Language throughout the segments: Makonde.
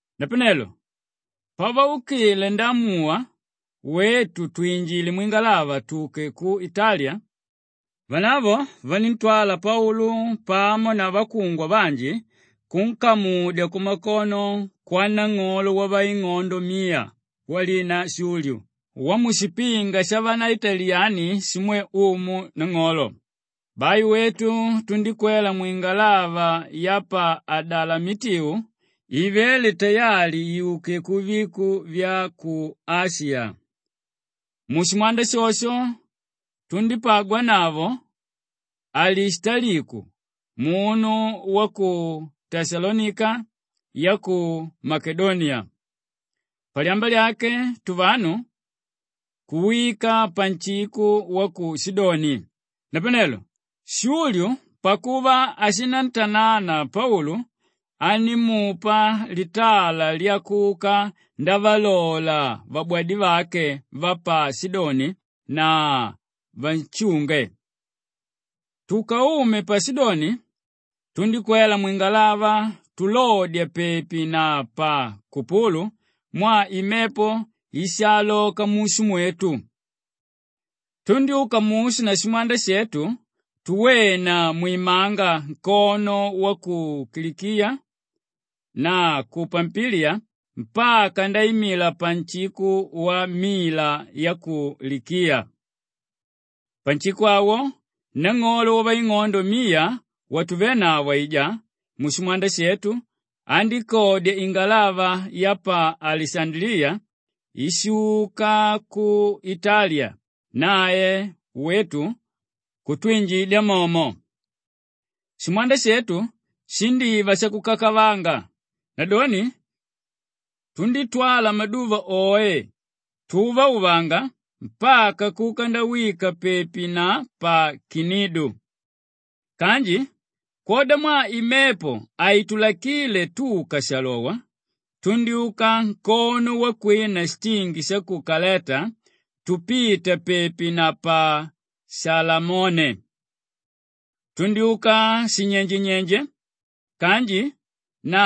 Napanelo pavaukile ndaamuwa wetu twinjile mwingalava tuke ku Italiya, vanavo vaníntwala Paulu pamo na vakungwa vanji kunkamudya kumakono kwanang'olo wavaing'ondo miya walina Shulyu wamushipinga shavaitaliyani shimwe umu nang'olo. Bai wetu tundíkwela mwingalava ya pa Adalamitiu ivéle tayali yuke kuviko vya ku Ashiya. Mushimwanda shosho tundípagwanavo Alishitaliku munu wa ku Teshalonika ya ku Makedoniya. Palyamba lyake tuvanu kuwika panshiko wa ku Shidoni. Napanelo Shulyu pakuva ashinantanana Paulu, andímupa litala lyakuka ndavalola vabwadivake va pa Shidoni na vanshunge. Tukaume pa Shidoni, tundíkwela mwingalava tulodya pepi na pa Kupulu mwaa imepo ishaaloka mushu mwetu. Tundyúka mushu na shimwanda shetu tuwena mwimanga nkono wa ku Kilikiya na ku Pampiliya mpaka ndaimila panshiko wa Mila ya ku Likiya. Panshiko awo nang'olo wavaing'ondo miya watuvénavo aijá mushimwanda shetu, andíkodya ingalava ya pa Alishandaliya íshuka ku Italiya, nae wetu kutwinjidya momo. Shimwanda shetu shindíva shakukakavanga; nadoni tundítwala maduva oe tuvauvanga mpaka kuka ndawika pepi na pa Kinidu. Kanji kwodamwaa imepo haitulakile tuka shalowa, tundyúka nkono wakwina shitingi sha Kaleta tupita pepi na pa Shalamone. Tundyúka shinyenjenyenje kanji na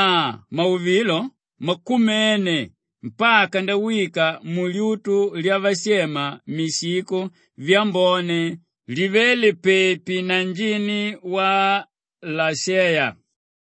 mauvilo makumene mpaka ndawika mulyutu lyavashema Mishiko Vyambone livéle pepi na njini wa Lasheya.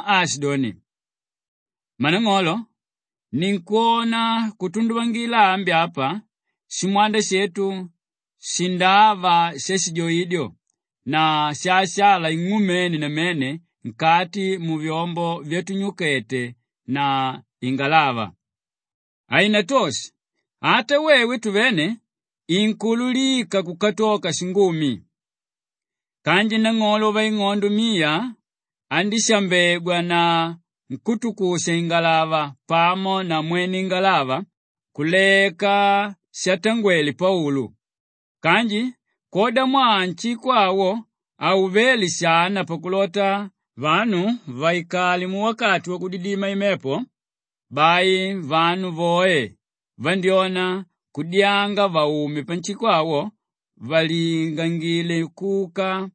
aashidoni, “Mmanang'olo, ninkwona kutunduvangila ambi apa shimwanda shetu shindava shashijoidyo na shaasala ing'umene namene nkati muvyombo vyatunyukete na ingalava. Hainatoshe ata wewe tuvene inkuululika kukatoka shingumi.” Kanji nang'olo wavaing'ondo miya andíshambegwa na nkútukusha-ingalava pamo na mwene ingalava kuleka shatangwele Paulu. Kanji kwodamwaa nshiko awo hauvéle shana pakulota vanu vaikale muwakati wakudidima imepo, bai vanu voe vandyóna kudyanga vaume panshiko awo valingangile kuka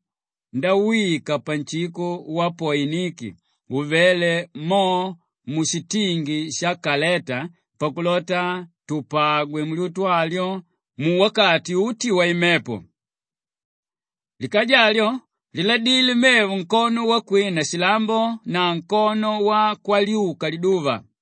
ndawika panshiko wa Poiniki uvéle mo mushitingi sha Kaleta pakulota tupagwe mulyutu alyo muwakati uti waimepo. Likaja alyo liladilé mevo nkono wakwina shilambo na nkono wakwalyuka liduva.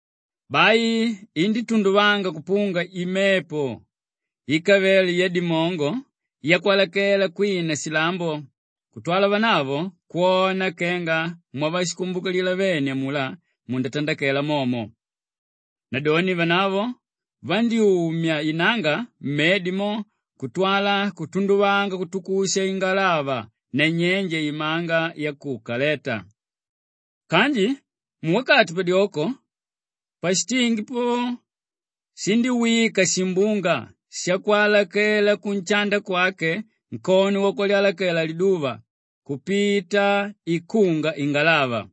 Bai indítunduvanga kupunga imepo íkavele yadimongo yakwalakela kwina shilambo kutwala vanavo kwona kenga mwavashikumbukilila vene amulá mundatandakela momo. Nadoni vanavo vandyúmya inanga mmedi mo kutwala kutunduvanga kutukusha ingalava nanyenje imanga ya ku Kaleta. Kanji muwakati padyoko pashitingi po shindíwika shimbunga shakwalakela kunshanda kwake nkono wakwalakela liduva kupita ikunga ingalava.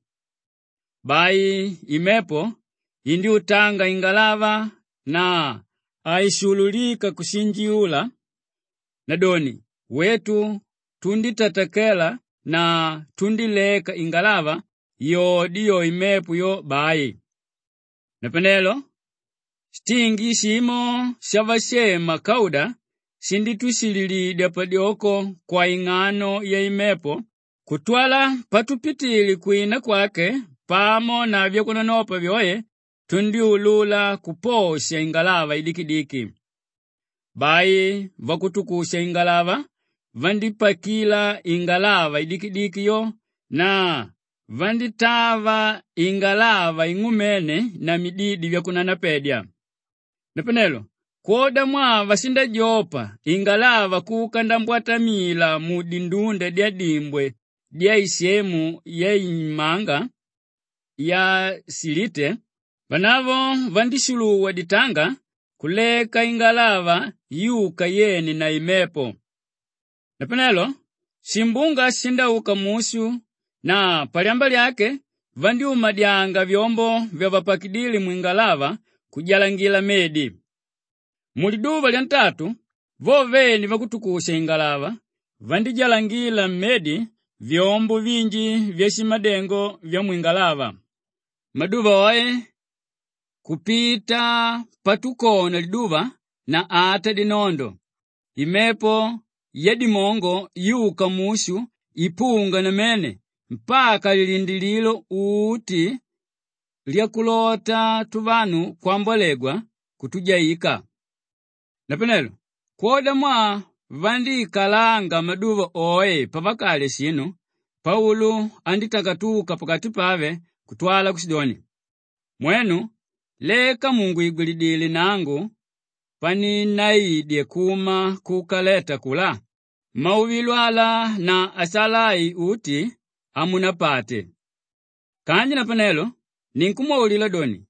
Bai imepo indyútanga ingalava na haishululika kushinjiula; nadoni wetu tundítatakela na tundíleka ingalava yode yo imepo yo bai. Napanelo shitingi shimo shavashema Kauda shindítushililidya padyoko kwaing'ano yaimepo kutwala patupitile kwina kwake pamo na vyakunanopa vyoe tundyúlula kuposha ingalava idikidiki. Bai vakutukusha-ingalava vandípakila ingalava idikidiki yo na vandítava ingalava ing'umene na mididi vyakunanapedya. Napanelo kwodamwaa vashindajopa ingalava kuka ndambwatamila mudindunda dyadimbwe dyamwisemu yaimanga ya Shilite, vanavo vandíshuluwa ditanga kuleka ingalava yuka yene na imepo. Napanelo shimbunga shishindauka mushu na palyamba lyake vandyúmadyanga vyombo vyavapakidíle mwingalava kujalangila mmedi. Muliduva lyantatu vo vene vakutukusha-ingalava vandíjalangila mmedi vyombo vinji vyashimadengo vyamwingalava. Maduva oe kupita patukona liduva na ata dinondo, imepo yadimongo yuka mushu ipunga namene mpaka lilindilililo uti lyakulota tuvanu kwambolegwa, kutujaika. Napanelo kwodamwaa vandíikalanga maduva oe pavakalya shinu, Paulu andítakatuka pakati pave kutwala kushidoni, “Mwenu! Leka mùngwigwilidile nangu paninnaidye kuma ku Kaleta akulá, mauvilo ala na asala ai uti hamunapate. Kanji napanelo ninkumwaulila doni,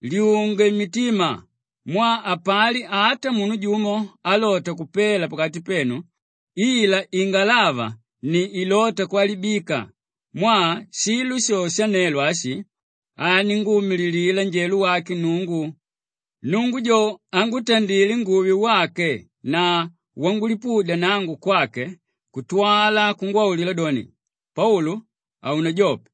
lyunge mitima mwaa hapali ata munu jumo álota kupela pakati penu ila ingalava ni ilóta kwalibika mwaa shilo sho shanelo ashi aninguumililila njelo wake Nnungu, Nnungu jojo ángutandile nguve wake na wangulipudya nangu kwake kutwala kungwaulila doni, ‘Paulu, haunajope!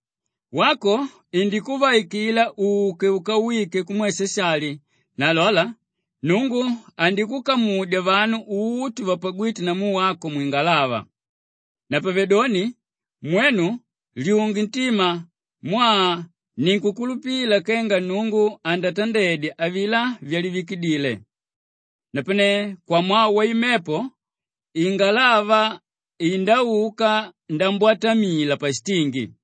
Wako indikuvaikila uke ukawike kumwe Shashali na lola, Nnungu andikukamudya vanu uti vapagwíte namu wako mwingalava.’ Napavedoni mwenu lyunge ntima mwaa ninkukulupila kenga Nnungu andatandedya avilá vyangwaulidile. Napane kwamwaa waimepo ingalava indauka ndambwatamila pashitingi.”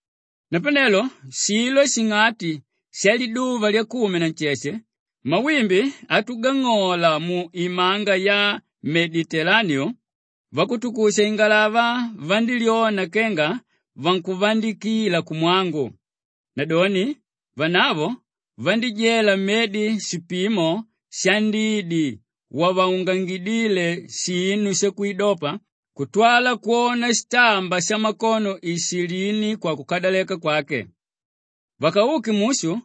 Napanelo shilo shing'ati shaliduva lyakumi na nsheshe mawimbi atugang'ola mu Imanga ya Meditelaniu, vakutusha-ingalava vandílyona kenga vankuvandikila kumwangu. Nadoni vanavo vandíjela mmedi shipimo shandidi wavaungangidíle shinu shakwidopa kutwala kwona shitamba shamakono ishilini kwakukadaleka kwake. Vakauke mushu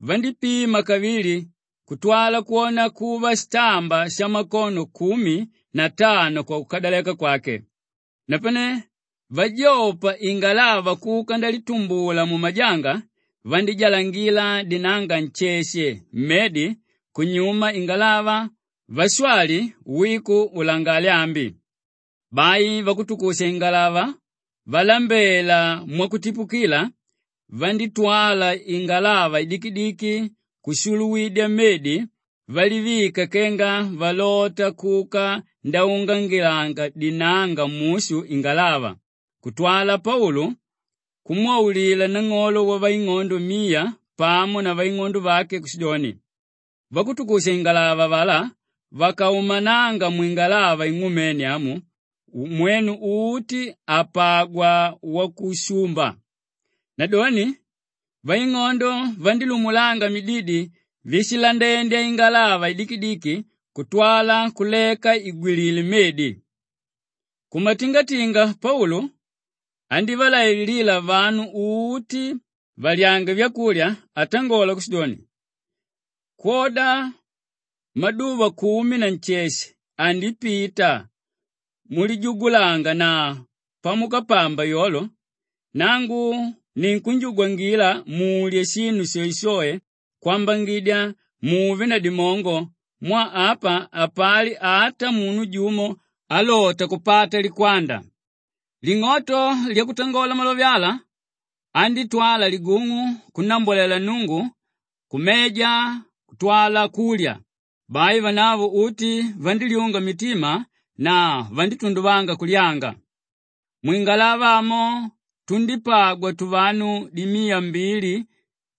vandípima kavili kutwala kwona kuva shitamba shamakono kumi na tano kwakukadaleka kwake. Napane vajopa ingalava kuka ndalitumbula mumajanga, vandíjalangila dinanga nsheshe mmedi kunyuma ingalava vashwali wiku ulangale ambi. Bai vakutukusha-ingalava valambela mwakutipukila vandítwala ingalava idikidiki kushuluwidya mmedi valivika kenga valota kuka ndaungangilanga dinanga mushu ingalava kutwala Paulu kumwaulila nang'olo wavaing'ondo miya pamo na vaing'ondo vake kushidoni, “Vakutukusha-ingalava avalá vakaumananga mwingalava ing'umene amu, mwenu uti hapagwa wakushumba.” Nadoni vaing'ondo vandílumulanga mididi víshilandendya ingalava idikidiki kutwala kuleka igwilila mmedi. Kumatingatinga Paulu andívalaililila vanu uti valyange vyakulya atangola kushidoni, “Kwoda maduva kumi na nsheshe andipita mulijugulanga na pamukapamba yolo, nangu ninkunjugwangila mulye shinu shoeshoe kwambangidya muve na dimongo mwaa apa hapali ata munu jumo álota kupata likwanda.” Ling'oto lyakutangola malove ala, andítwala ligung'u kunnambwalela Nnungu kumeja kutwala kulya. Bai vanavo uti vandílyunga mitima na vandítunduvanga kulyanga. Mwingalava amo tundípagwa tuvanu dimiya mbili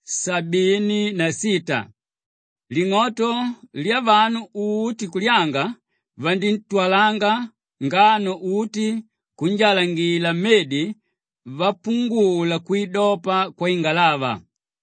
sabini na sita. Ling'oto lyavanu uti kulyanga, vaníntwalanga ngano uti kunjalangila mmedi vapungula kwidopa kwaingalava.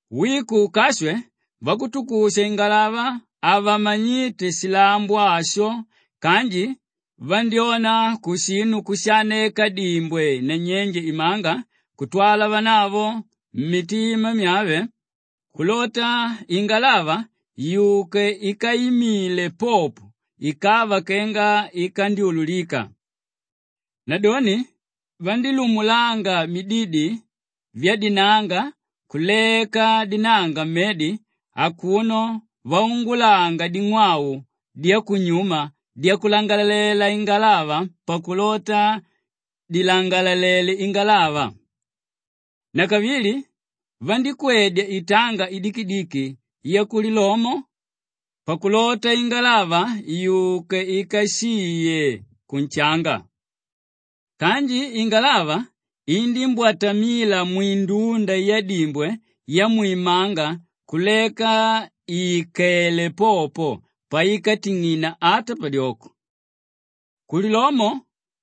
Wiku ukashwe, vakutukusha-ingalava havamanyíte shilambo asho kanji vandyóna kushinu kushaaneka dimbwe nanyenje imanga kutwala vanavo mmitima vyave kulota ingalava yuke ikaimile popo ikava kenga ikandyululika. Nadoni vandílumulanga mididi vyadinanga kuleka dinanga mmedi akuno vaungulanga ding'wau dyakunyuma dyakulangalalela ingalava pakulota dilangalalele ingalava. Nakavili vandíkwedya itanga idikidiki yakulilomo pakulota ingalava yuke ikashiye kunshanga. Kanji ingalava indímbwatamila mwindunda yadimbwe yamwimanga kuleka ìkele popo paikating'ina ata padyoko. Kulilomo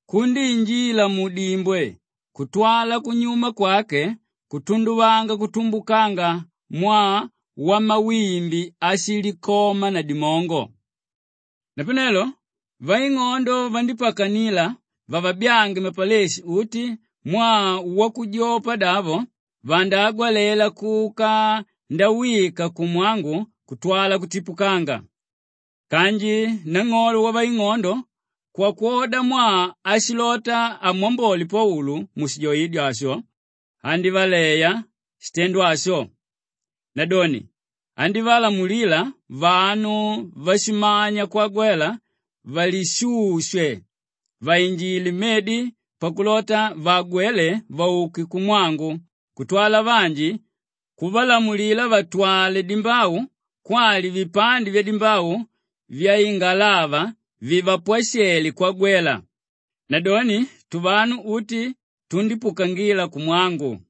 kundíinjila mudimbwe kutwala kunyuma kwake kutunduvanga kutumbukanga mwaa wamawimbi áshilikoma na dimongo. Napanelo vaing'ondo vandípakanila vavabyange mapaleshi uti mwaa wakujopadavo vandaagwalela kuka ndawika kumwangu kutwala kutipukanga. Kanji nang'olo wavaing'ondo kwodamwaa ashilota amwambole Paulu mushijoidyo asho, andívaleya shitendo asho. Nadoni andívalamulila vanu váshimanya kwagwalela valishushe vainjile mmedi pakulota vaagwele vauke kumwangu kutwala vanji kuvalamulila vatwale dimbau kwali vipande vyadimbau vyaingalava vivapwashele kwagwela. Nadoni tuvanu uti tundípukangila kumwangu.